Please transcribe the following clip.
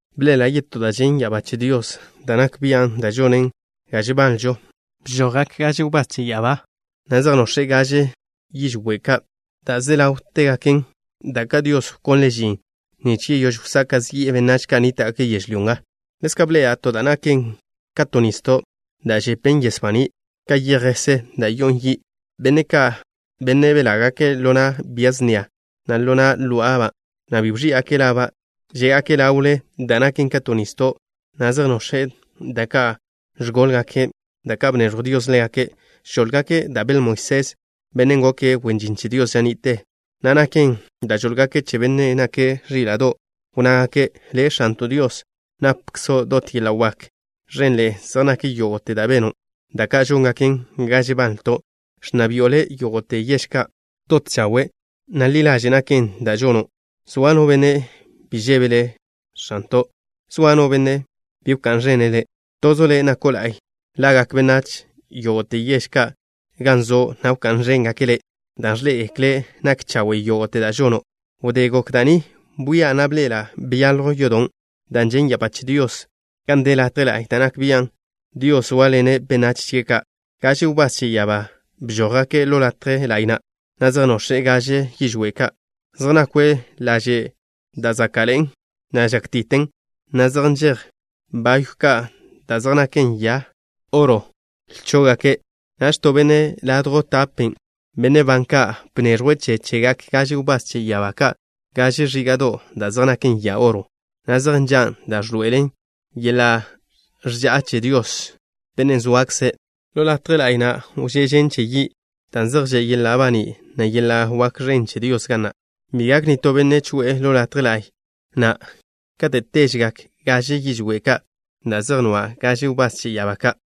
Bḻe'ela' yetó da' ẕen ya'abá che Dios da' nak bian', da' žonen ga žebanlžo. Bžojgak gaže wbás che ya'abá, na' zej nox̱e' gaže yižwé' ka' da' ze ḻáwtegaken, da' ka' Dios wkonle' žin nich yeyóž wsaka' zi'e benách ka' nníta'gake' yežlyó nga. Ḻezka' bḻe'ela' to da' naken ka to nisdo' da' žepen yes baní' ka yej jese da' yo'on yi'. Benne' ka', benne' belágake' ḻo na' bia snia, na' ḻo na' ló'aba', na' bi wẕí'gake' laba', zégake' ḻawle da' naken ka to nisdo', na' zej nox̱e' da' ka' ẕgóḻgake', da' ka' bneẕjw Dios ḻégake'. Žóḻgake' da' beḻ Moisés, bennen' goke' wen žin che Dios ža ni'te, na' naken da' žóḻgake' che Bennen' nake' Ẕíla'do'. Wnnágake': Le', X̱anto' Dios, napkzo' dot yeḻa' wak. Ẕenḻe'e zej nak yógo'te da' beno', da' ka' žóngaken ga žebanlto'. Ẕnna bi'o Le' yógo'te yež ka'. Dot chawe', na' ḻi ḻaže' naken da' žono'. ¿Zoa no benne' bi žebe' Le', X̱anto'? ¿Zoa no benne' bi wká'n ẕene' Le'? Tozo' Le' nako' la'y. Ḻa'gak benách yógo'te yež ka' gan zo', na' wká'n ẕéngake' Le' dan' ẕḻé'egekle' nak chawe' yógo'te da' žono'. Wdé gok da' ni, bwia', na' bḻe'ela' byaljw yodon' da' žen' ya'abá che Dios gan de latje la'y da' nak bian' Dios zóaḻene' benách chie' ka'. Gaže wbás che ya'abá bžójgake' ḻo latje la'y na', na' zej nox̱e' gaže yižwé' ka'. Zej nakwe' laže' da' záka'ḻe'en, na' žákti'ten, na' zej nžej bayw ka' da' zej naken ya oro lchó'gake'. Naž to benne' ladjw tape benne' ban ka' bneẕjwe' che chegak gaže wbás che ya'abá ka' gaže ẕíga'do' da' zej naken ya oro, na' zej nžan' da' ẕḻoe'elen yeḻa' ẕža'a che Dios, Bennen' zoakze'. Ḻo latje la'y na' wžé' žen che yi', dan' zej že' yeḻa' baní', na' yeḻa' wak ẕen che Dios ga na'. Bi gak nitó benne' choe'e ḻo latje la'y na' kate' téžegak gaže yižwé' ka' da' zej nwa' gaže wbás che ya'abá ka'.